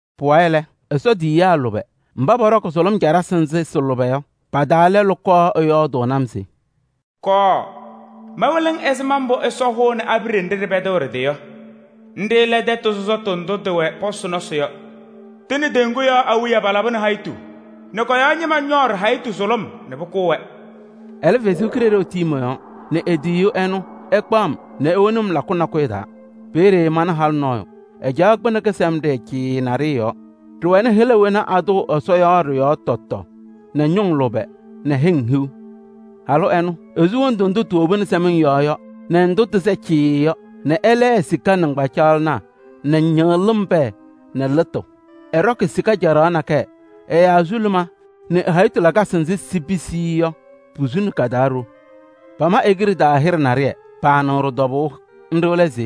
Pʋwayɩ lɛ, Ɛsɔ tiyiyaa lʋbɛ mba pɔɖɔkɩ sʋlʋm caɖasɩ nzɩ sɩ-lʋbɛ yɔ, pa-taa lɛlʋ kɔɔ ɛyɔɔdʋʋnɩ-m se: “Kɔɔ, mawɩlɩɣ-ŋ ɛzɩma mbʋ Ɛsɔ hʋʋnɩ abiɖe nɖɩ ɖɩpɛdɩɣ ɖɩ-tɩ yɔ. Nɖɩ lɛ tɛtʋ sɔsɔtʋ ndʋ tɩwɛ pɔsɩ nɔsɩ yɔ. Tɩ nɛ kedeŋa yɔɔ awiya palabɩ hayitu nɛ kɔ-yɔɔ ñɩma ñɔɔ ɖɩ-hayitu sʋlʋm nɛ pʋkʋʋ-wɛ.” Ɛlɛ Ɛsɔ Kalɩzaɣ tii mɔ-yɔɔ nɛ e-tiyiyu ɛnʋ ɛkpaɣ-m nɛ ewoni lakʋ nakʋyʋ taa. Peeye mana halʋ nɔɔyʋ, ɛcaɣ kpɩnɛ kɩsɛmɖɩyɛ cɩɩɩ naɖɩyɛ yɔɔ. Ɖɩwɛnɩ hɩla wena atʋʋ Ɛsɔ yɔ ɖɩ-yɔɔ tɔtɔ nɛ ñʋŋ lʋbɛ nɛ hɩŋ hiu. Halʋ ɛnʋ, esu wondu ndʋ tiwobini sɛmɩŋ yɔɔ yɔ nɛ ndʋ tɩsɛ cɩɩɩ yɔ nɛ ɛlɛɛ sika nɩŋgbacaɣlɩnaa nɛ ñɩɣlɩm pɛɛ nɛ lɩtʋ. Ɛɖɔkɩ sika caɖaɣ nakɛyɛ, ɛ-azuluma nɛ ɛ-hayitu lakasɩ nzɩ sipisiɣ-i yɔ posuni ka-taa ɖo. Pama e-kiɖe taa hɩɖɛ naɖɩyɛ. Paanɩɣ ɖɩ-tɔbʋʋ, nɖɩ lɛ se: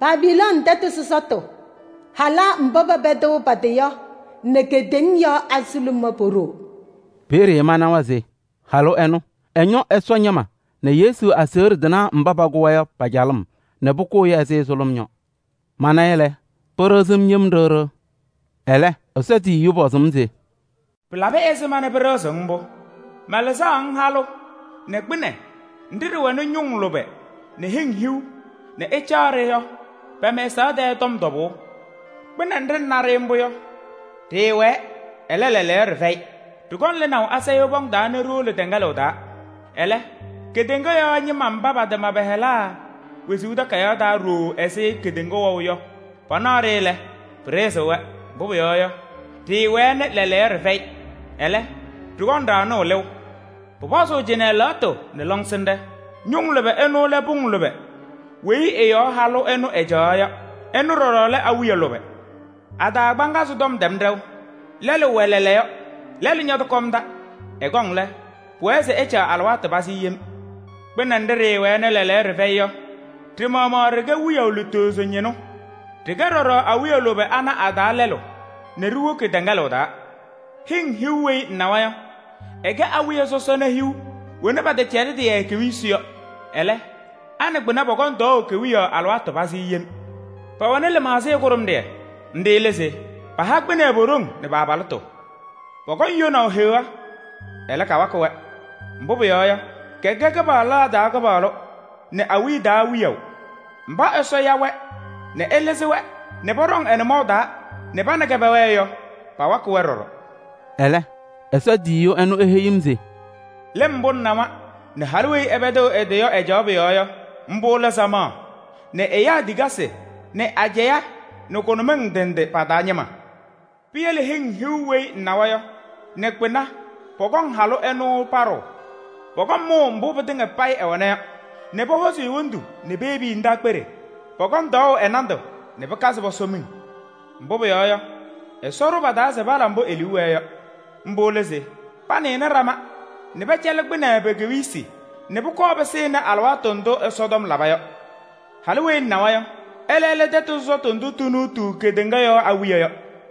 “Babilooni tɛtʋ sɔsɔtʋ, halaa mba pɛpɛdɩɣ pa-tɩ yɔ nɛ kedeŋa yɔɔ azuluma po-ɖoo.” Peeye manawa se halʋ ɛnʋ ɛñɔ Ɛsɔ ñɩma nɛ Yesu aseɣɖe tɩnaa mba pakʋ-wɛ yɔ pa-calɩm nɛ pʋkʋʋ-ɩ ɛzɩ sʋlʋm yɔ. Mana-ɩ lɛ, pɩɖɩɣzɩ-m yem ɖɩɣ ɖɩɣ. Ɛlɛ, Ɛsɔ tiyiyu pɔzɩ-m se: “Pɩlabɩ ɛzɩma nɛ pɩɖɩɣzɩɣ-ŋ mbʋ? Malɩzɩɣ-ŋ halʋ nɛ kpɩnɛ nɖɩ ɖɩwɛnɩ ñʋŋ lʋbɛ nɛ hɩŋ hiu nɛ ɛcaɣ-ɖɩ yɔ pɛ-mɛsaɣ tɛɛ tɔm tɔbʋʋ. Kpɩnɛ nɖɩ ŋna mbʋ yɔ, ɖɩɩwɛɛ, ɛlɛ, lɛɛlɛɛyɔ ɖɩfɛyɩ. Ɖɩkɔŋ lɩnaʋ asayʋʋ pɔʋ taa nɛ ɖiwolo tɛŋɛlʋʋ taa. Ɛlɛ kedeŋa yɔɔ ñɩma mba patama pa-hɩla wezuu takayaɣ taa ɖooo ɛzɩ kedeŋa wɛʋ yɔ, panaɣ-ɖɩ lɛ, pɩɖɩɣzɩɣ-wɛ. Mbʋ pʋyɔɔ yɔ, ɖɩɩwɛɛ nɛ lɛɛlɛɛyɔ ɖɩfɛyɩ, ɛlɛ, ɖɩkɔŋ ɖaɣnʋʋ lɩʋ. “Pʋpɔzʋʋ cɩnɛ lɛɣtʋ nɛ lɔŋsɩnɖɛ: ñʋŋ lʋbɛ ɩnʋ lɛ pʋŋ lʋbɛ weyi ɩ-yɔɔ halʋ ɛnʋ ɛcaɣaɣ yɔ. Ɩnʋ ɖɔɖɔ lɛ awiya lʋbɛ: a-taa kagbaanzɩ tɔm ɖɛwa, lɛlʋ wɛ lɛɛlɛɛyɔ, lɛlʋ ñɔtɔkɔmda. Ɛkɔŋ lɛ, pʋwɛɛ se ɛcaɣ alɩwaatʋ pazɩ yem. Kpɩnɛ nɖɩ ɖɩɩwɛɛ nɛ lɛɛlɛɛyɔ ɖɩfɛyɩ yɔ, ɖɩ-maɣmaɣ ɖɩkɛ wiyaʋ lutozo ñɩnʋ. Ɖɩkɛ ɖɔɖɔ awiya lʋbɛ ana a-taa lɛlʋ nɛ ɖiwoki tɛŋɛlʋʋ taa. “Hɩŋ hiu weyi ŋnawa yɔ, ɩkɛ awiya sɔsɔna hiu wena pɛtɛcɛlɩdɩ-yɛ kewiyisi yɔ. Ɛlɛ, a nɛ kpɩnɛ pɔkɔŋ tɔɔʋ kewiyaɣ alɩwaatʋ pazɩ yem. Pɛwɛnɩ lɩmaɣzɩyɛ kʋɖʋmɖɩyɛ. Nɖɩ lɛ se: paha kpɩnɛ po-ɖoŋ nɛ pa-abalɩtʋ. Pɔkɔŋ yonaʋ Heɣa, ɛlɛ, kawakɩ-wɛ. Mbʋ pʋyɔɔ yɔ, kɛkɛ kɩpaɣlaa taa Kɩpaɣlʋ nɛ awiya taa Wiyaʋ. Mba Ɛsɔ ya-wɛ nɛ ɛlɩzɩ-wɛ nɛ pɔɖɔŋ ɛ-nʋmɔʋ taa nɛ pa nɛ kɛ pɛwɛɛ yɔ, pawakɩ-wɛ ɖɔɖɔ.” Ɛlɛ, Ɛsɔ tiyiyu ɛnʋ eheyi-m se: “Lɩm mbʋ ŋnawa nɛ halʋ weyi ɛpɛdɩɣ ɛ-tɩ yɔ ɛcaɣ pʋ-yɔɔ yɔ, mbʋ lɛ samaɣ nɛ ɛyaa tikasɩ nɛ ajɛɛ nɛ kʋnʋmɩŋ ndɩ ndɩ pa-taa ñɩma. Piyele hɩŋ hiu weyi ŋnawa yɔ nɛ kpɩnɛ pɔkɔŋ halʋ ɛnʋ paɖʋʋ: pɔkɔŋ mʋʋ mbʋ pɩtɩŋa payɩ ɛwɛna yɔ nɛ pɔhɔzɩ e-wondu nɛ piyebi-i ndaakpeɖe. Pɔkɔŋ tɔɔʋ ɛ-nandʋ nɛ pɩkazɩ pɔsɔ miŋ. Mbʋ pʋyɔɔ yɔ, Ɛsɔ ɖʋ pa-taa se pala mbʋ e-liu wɛɛ yɔ. Mbʋ lɛ se panɩnɩ ɖama nɛ pɛcɛlɩ kpɩnɛ pe-kewiyisi nɛ pʋkɔɔ pɩsɩnɩ alɩwaatʋ ndʋ Ɛsɔtɔm laba yɔ. “Halʋ weyi ŋnawa yɔ, ɛlɛ lɛ tɛtʋ sɔsɔtʋ ndʋ tinuutuu kedeŋa yɔɔ awiya yɔ.”